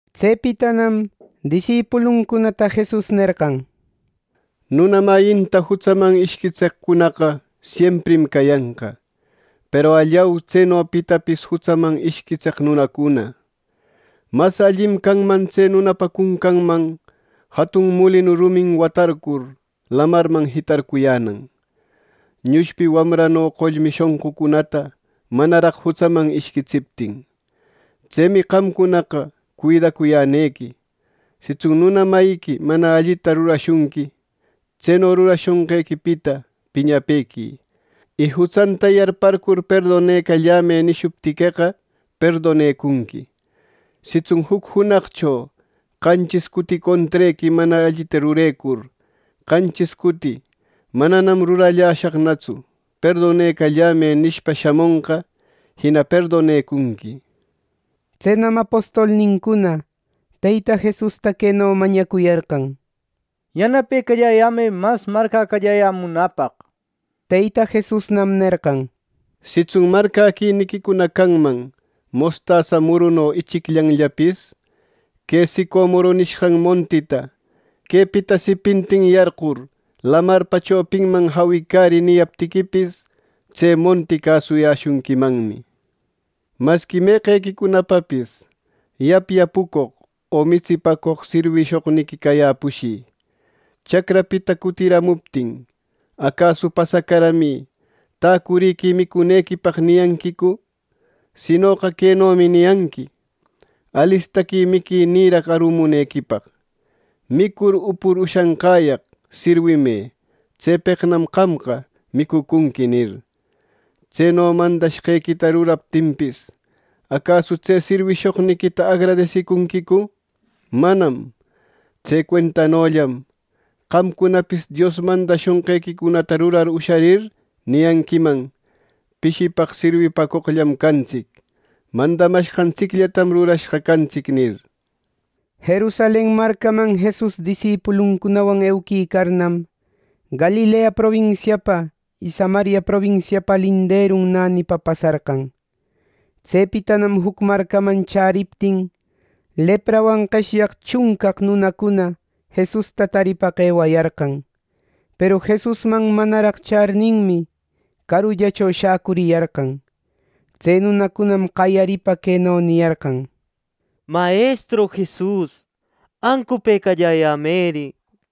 Tsepitanam disipuluncunata Jesus nerqan, “Nuna mayinta jutsaman ishquitseqcunaqa siemprim cayanqa. Peru ¡allau, tseno pitapis jutsaman ishquitseq nunacuna! Mas allim canman tse nunapa cuncanman jatun mulinu rumin watarcur lamarman jitarcuyänan, nushpi wamrano qollmi shonqucunata manaraq jutsaman ishquitsiptin. Tsemi ¡qamcunaqa cuidacuyänequi! “Sitsun nuna mayiqui mana allita rurashunqui, tseno rurashonqequipita piñapequï. Y jutsanta yarparcur ‘Perdonecallämë’ nishuptiqueqa, perdonecunqui. Sitsun juc junaqcho qanchis cuti contrequi mana allita rurecur, qanchis cuti ‘Mananam ruralläshaqnatsu; perdonecallämë’ nishpa shamonqa, jina perdonecunqui.” Tsenam apostolnincuna Teyta Jesusta queno mañacuyarqan: —Yanapecalläyämë mas marcäcalläyämunäpaq —nir. Teyta Jesusnam nerqan: —Sitsun marcäquiniquicuna canman mostasa muruno ichicllanllapis, que sicomoro nishqan montita ‘Quepita sipintin yarqur lamarpa chopinman jawicärï’ niyaptiquipis, tse monti cäsuyäshunquimanmi. “Masqui, meqequicunapapis yapyapäcoq o mitsipäcoq sirwishoqniqui cayäpushï, chacrapita cutiramuptin, ¿acasu ‘Pasacaramï. Täcurïquï micurinequipaq’ niyanquicu! Sinoqa quenomi niyanqui: ‘Alistaqui miquinïraq arumunequipaq. Micur upur ushanqäyaq sirwimë; tsepeqnam qamqa micucunqui’ nir. Tseno mandashqequita rurariptinpis, ¿acasu tse sirwishoqniquita agradesicunquicu! ¡Manam! Tse cuentanollam qamcunapis Dios mandayäshonqequicunata rurar usharir niyanquiman, ‘Pishipaq sirwipacoqllam cantsic. Mandamashqantsiccunallatam rurashqa cantsic’ nir.” Jerusalen marcaman Jesus disipuluncunawan euquicarnam, Galilea probinsiapa y Samaria probinsiapa linderun nänipa pasarqan. Tsepitanam juc marcaman chäriptin, leprawan qeshyaq chuncaq nunacuna Jesusta taripaq ewayarqan. Peru Jesusman manaraq charninmi, carullacho shäcuriyarqan. Tse nunacunam qayaripa queno niyarqan: —Mayestru Jesus, ¡ancupëcalläyämeri!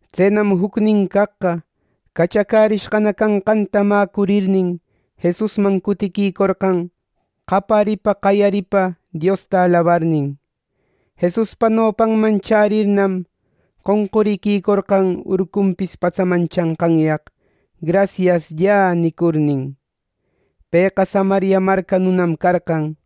Tsenam jucnin caqqa, cachacärishqa canqanta mäcurirnin, Jesusman cutiquicorqan qaparipa qayaripa Diosta alabarnin. Jesuspa nopanman chärirnam, qonquriquicorqan urqunpis patsaman chanqanyaq “Grasiasllä” nicurnin. Pëqa Samaria marca nunam carqan.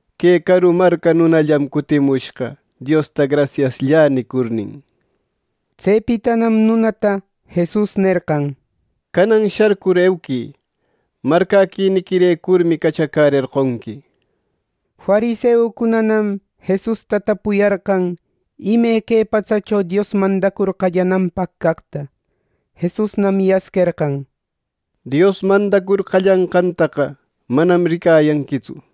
Que caru marca nunallam cutimushqa, Diosta ‘Grasiasllä’ nicurnin. Tsepitanam nunata Jesus nerqan: —Canan sharcur euquï. Marcäquiniquirecurmi cachacärerqonqui —nir. Fariseucunanam Jesusta tapuyarqan ime que patsacho Dios mandacur qallananpaq caqta. Jesusnam yasquerqan: —Dios mandacur qallanqantaqa manam ricayanquitsu.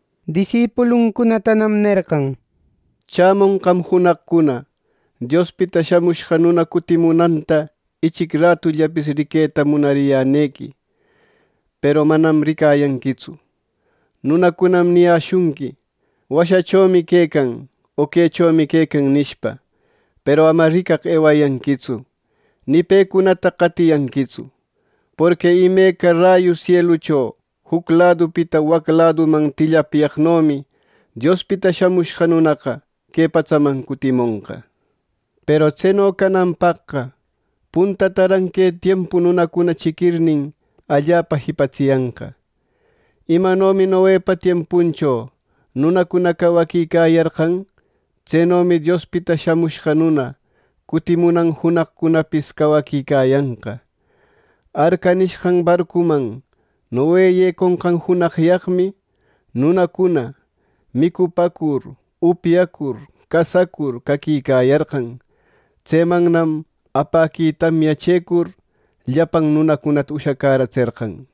Disipuluncunatanam nerqan: —Chämonqam junaqcuna Diospita Shamushqa Nuna cutimunanta ichic ratullapis riqueta munariyänequi; peru manam ricayanquitsu. Nunacunam niyäshunqui: ‘Washachomi quecan’ o ‘Quechomi quecan’ nishpa. Peru ama ricaq ewayanquitsu; ni pecunata qatiyanquitsu. Porqui imeca rayu sielucho juc ladupita wac laduman tillapyecoqnomi Diospita Shamushqa Nunaqa que patsaman cutimonqa. Peru tseno cananpaqqa puntataran que tiempu nunacuna chiquirnin allapa jipatsiyanqa. Imanomi Noepa tiempuncho nunacuna cawaquicayarqan; tsenomi Diospita Shamushqa Nuna cutimunan junaqcunapis cawaquicayanqa. Arca nishqan barcuman Noe yeconqan junaqyaqmi, nunacuna micupäcur, upyacur, casacur caquicayarqan. Tsemannam apäqui tamya chëcur, llapan nunacunata ushacäratserqan.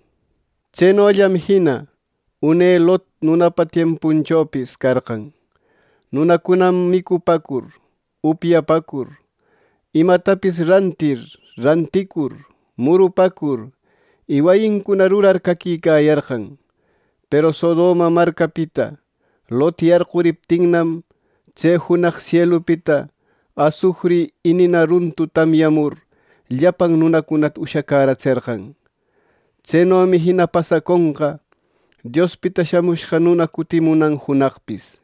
Tsenollam jina une Lot nunapa tiempunchopis carqan. Nunacunam micupäcur, upyapäcur, imatapis rantirnin ranticur, murupäcur y wayincuna rurar caquicayarqan. Peru Sodoma marcapita Lot yarquriptinnam, tse junaq sielupita asufri y nina runtu tamyamur, llapan nunacunata ushacäratserqan. Tsenomi jina pasaconqa Diospita Shamushqa Nuna cutimunan junaqpis.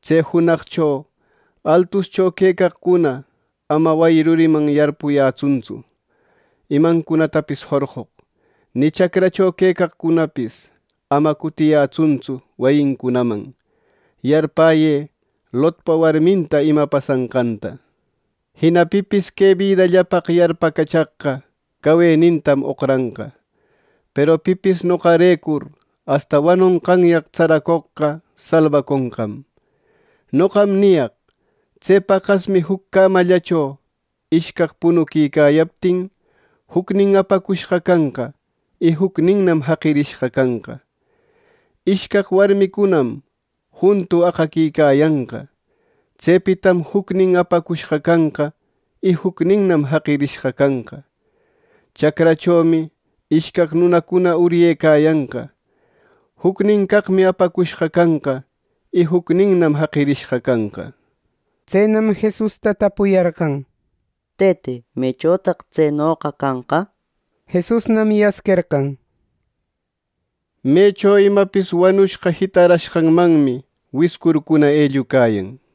“Tse junaqcho altuscho quecaqcuna ama wayi ruriman yarpuyanqatsu imancunatapis jorqoq. Ni chacrancunacho quecaqcunapis ama cutiyanqatsu wayincunaman. Yarpäyë Lotpa warminta ima pasanqanta. Jina pipis que bidallapaq yarpacachaqqa, cawenintam oqranqa. Peru pipis noqarecur asta wanonqanyaq tsaracoqqa salbaconqam. “Noqam niyaq: Tse paqasmi juc cämallacho ishcaq punuquicayaptin, jucnin apacushqa canqa, y jucninnam jaqirishqa canqa. Ishcaq warmicunam juntu aqaquicayanqa. Tsepitam jucnin apacushqa canqa, y jucninnam jaqirishqa canqa. ˻Chacrachomi ishcaq nunacuna uryecayanqa. Jucnin caqmi apacushqa canqa, y jucninnam jaqirishqa canqa˼” nir. Tsenam Jesusta tapuyarqan: —Tëte, ¿mechotaq tsenoqa canqa? Jesusnam yasquerqan: —Mecho imapis wanushqa jitarashqanmanmi wiscurcuna ellucayan.